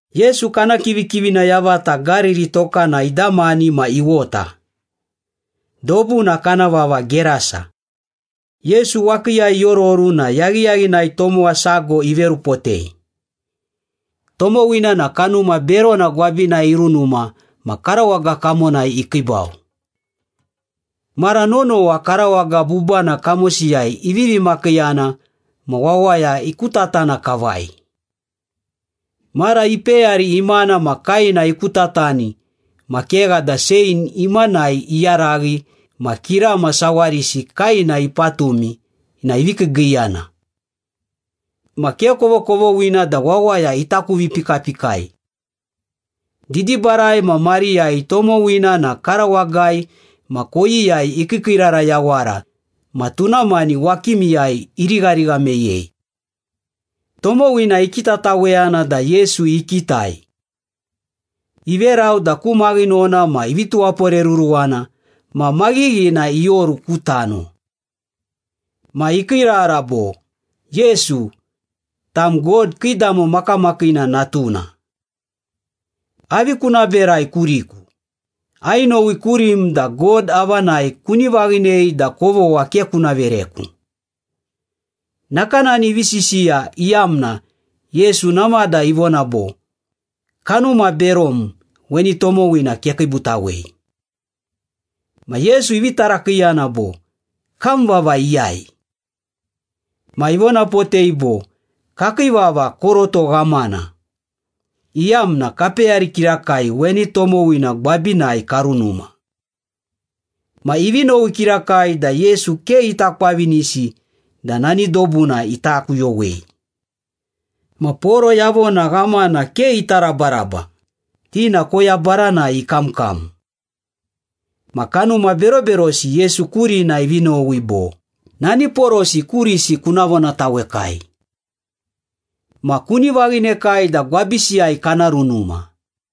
Yesu kana kivikivina yavata Gariri tokana idamani ma iwota. Dobuna kana vava Gerasa. Yesu wakiiyai iororu na yaghiyaghinai tomowa sago iverupotei. Tomowina na kanuma berona gwabinai irunuma ma karawaga kamonai ikiibau. Mara nonowa karawaga bubana kamosiyai ivivi makiiyana ma wawaya ikutatana kavai. Mara ipeyari imana ma kaena ikutatani ma kegha da chein imanai iyaraghi ma kirama sawarisi kaena ipatumi na ivi kiigiiyana. Ma ke kovokovoghina da wawaya ita kuvipikapikai. Didibarai ma mariyai tomowina na karawagai ma koyiyai ikiikiirara yawara ma tuna mani wakimiyai irigharigha meyei. Tomowina ikitataweyana da Yesu ikitai. Iverau da ku maghinona ma ivi tuwaporeruruwana ma maghighina ioru ku tano. Ma ikiirara bo, “Yesu, tam God Kiidamo Makamakiina Natuna. Avi kuna berai kuriku? Ainowi kurim da God avanai kuni vaghinei da kovogha ke kuna vereku.” Nakanani ivi sisiya iyamna Yesu namada ivona bo, “Kanuma berom, weni tomowina kekiibutawei.” Ma Yesu ivi tarakiiyana bo, “Kam vava iyai?” Ma ivonapotei bo, “Kakii vava Koroto Ghamana, iyamna kapeyari kirakai weni tomowina gwabinai karunuma.” Ma ivi nowi kirakai da Yesu ke ita kwavinisi da nani dobuna ita kuyowei. Ma poro yavona ghamana ke ita rabaraba, ti na koya baranai ikamkam. Ma kanuma beroberosi Yesu kurina ivi nowi bo, “Nani porosi kurisi kuna vonatawekai. Ma kuni vaghinekai da gwabisiyai kana runuma.”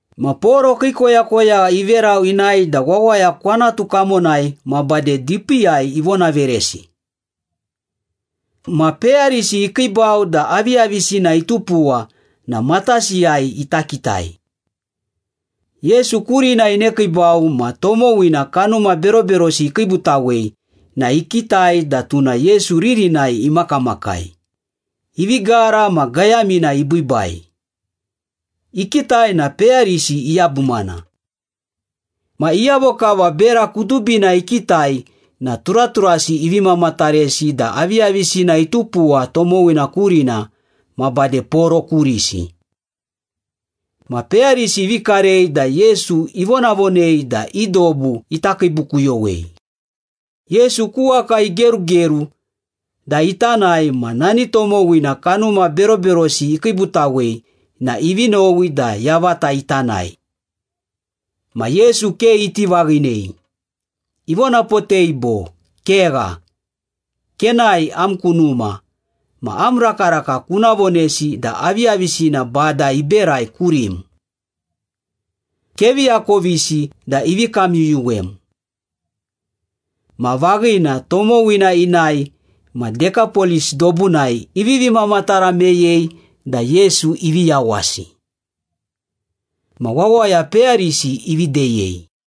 Ma poro kii koyakoyagha iverau inae da wawaya kwanatu kamonai ma bade dipiiyai ivonaveresi. Ma peyarisi ikiibau da aviyavisina itupuwa na matasiyai ita ikitai. Yesu kurina inekiibau ma tomowina kanuma beroberosi ikiibutawei na ikitai da tuna Yesu ririnai imakamakai, ivi gara ma gayamina ibiibai. Ikitai na peyarisi iyabumana. Ma iyavo kava bera kudubina ikitai na turaturasi ivi mamataresi da aviyavisina itupuwa tomowina kurina ma bade poro kurisi. Ma peyarisi ivi karei da Yesu ivonavonei da i dobu ita kiibukuyowei. Yesu ku waka igerugeru da ita nae ma nani tomowina kanuma beroberosi ikiibutawei na ivi nowi da yavata ita nae. Ma Yesu ke iti vaghinei, ivonapotei bo, “Kegha, kenae am ku numa ma am rakaraka kuna vonesi da aviyavisina Bada iberai kurim. Kevi akovisi da ivi kamyuyuwem.” Ma vaghina, tomowina inae ma Dekapolis dobunai ivivi mamatara meyei da Yesu ivi yawasi. Ma wawaya peyarisi ivi deyei.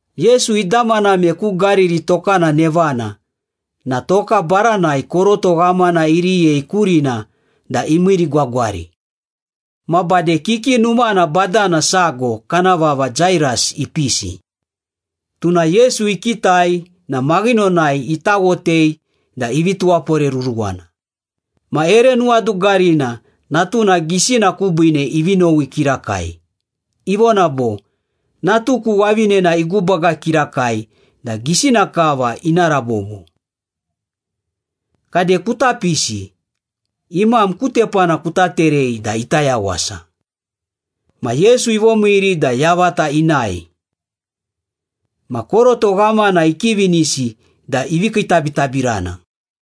Yesu idamaname ku Gariri tokana nevana na toka baranai koroto ghamana iriyei kurina da imiirigwagwari. Ma bade kiki numana badana sago kana vava Jairas ipisi. Tuna Yesu ikitai na maghinonai itawotei da ivi tuwaporeruruwana, ma ere nuwadugarina natuna gisina kubiine ivi nowi kirakai, ivona bo, “Natuku wavinena igubaga kirakai da gisina kava ina rabobo. Kade kuta pisi, imam ku tepana kuta terei da ita yawasa.” Ma Yesu ivomiiri da yavata inae. Ma koroto ghamana ikivinisi da ivi kiitabitabirana.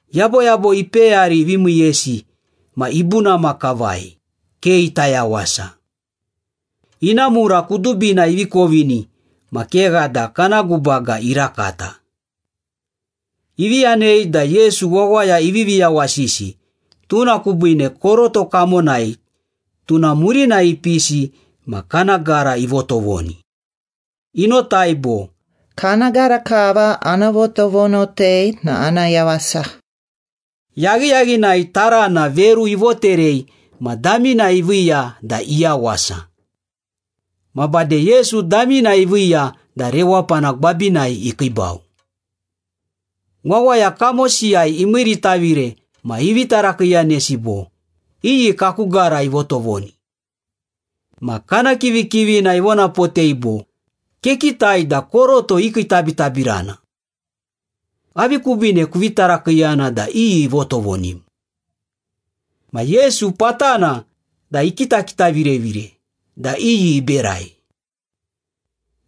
Yaboyabo ipeyari ivi miiyesi ma ibunama kavai, ke ita yawasa. Ina mura kudubina ivi kovini ma kegha da kana gubaga irakata. Ivi yanei da Yesu wawaya ivivi yawasisi, tuna kubiine koroto kamonai tuna murinai ipisi ma kana gara ivotovoni. Inotai bo, “Kana gara kava ana votovonotei na ana yawasa.” Yaghiyaghinai tarana veru ivoterei ma damina iviiya da iyawasa. Ma bade Yesu damina iviiya da rewapana gwabinai ikiibau. Wawaya kamosiyai imiiritavire ma ivi tarakiiyanesi bo, “Iyi kaku gara ivotovoni?” Ma kana kivikivina ivonapotei bo, “Kekitai da koroto ikiitabitabirana. Avi kubiine kuvi tarakiiyana da iyi ivotovonim?” Ma Yesu patana da ikitakitavirevire da iyi iberai.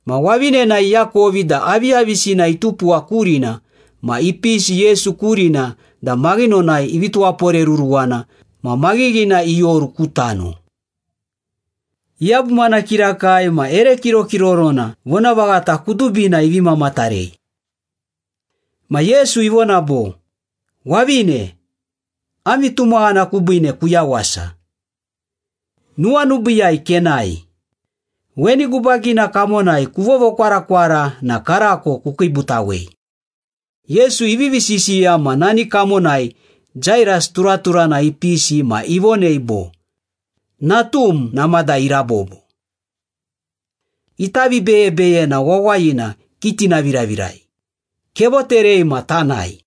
Ma wavinena iakovi da aviyavisina itupuwa kurina ma ipisi Yesu kurina da maghinonai ivi tuwaporeruruwana ma maghighina ioru ku tano. Iyabumana kirakai ma ere kirokirorona vonavaghata kudubina ivi mamatarei. Ma Yesu ivona bo, “Wavine, am vitumaghana kubiine kuyawasa. Nuwanubiiyai kenae. Weni gubagina kamonai kuvovokwarakwara na karako kukiibutawei.” Yesu ivivi sisiya ma nani kamonai Jairas turaturana ipisi ma ivonei bo, “Natum namada irabobo. Ita vibeyebeyena wawayina kitinaviravirai. Kevoterei ma tanae.”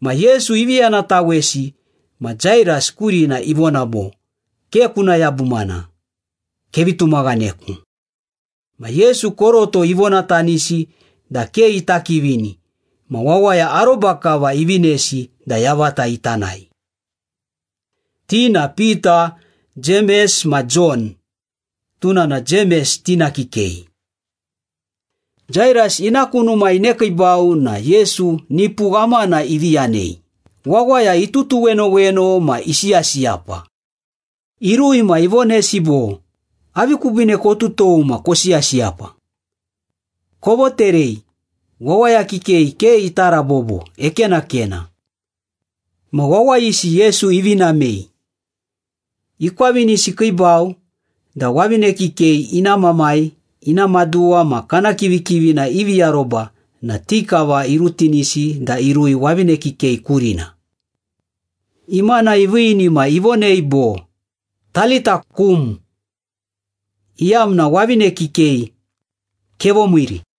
Ma Yesu ivi yanatawesi ma Jairas kurina ivona bo, “Ke kuna yabumana. Kevi tumaghaneku.” Ma Yesu koroto ivonatanisi da ke ita kivini ma wawaya aroba kava ivinesi da yavata ita nae. Ti na Pita, Jemes ma Jon (tuna na Jemes tina kikei). Jairas ina ku numa inekiibau na Yesu nipu ghamana ivi yanei, wawaya itutuwenoweno ma isiyasiyapa. Irui ma ivonesi bo, “Avi kubiine kotutou ma kosiyasiyapa? Kovoterei! Wawaya kikei ke ita rabobo, ekenakena.” Ma wawayisi Yesu ivi namei. Ikwavinisi ikiibau da wavine kikei ina mamai, ina maduwa, ma kana kivikivina ivi aroba na ti kava irutinisi da irui wavine kikei kurina. Imana iviini ma ivonei bo, “Talitha, koum” iyamna “Wavine kikei, kevomiiri.”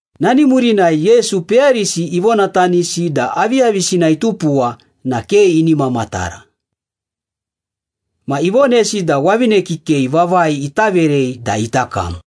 Nani murinai Yesu peyarisi ivonatanisi da aviyavisina itupuwa na ke ini mamatara. Ma ivonesi da wavine kikei vavai ita verei da ita kam.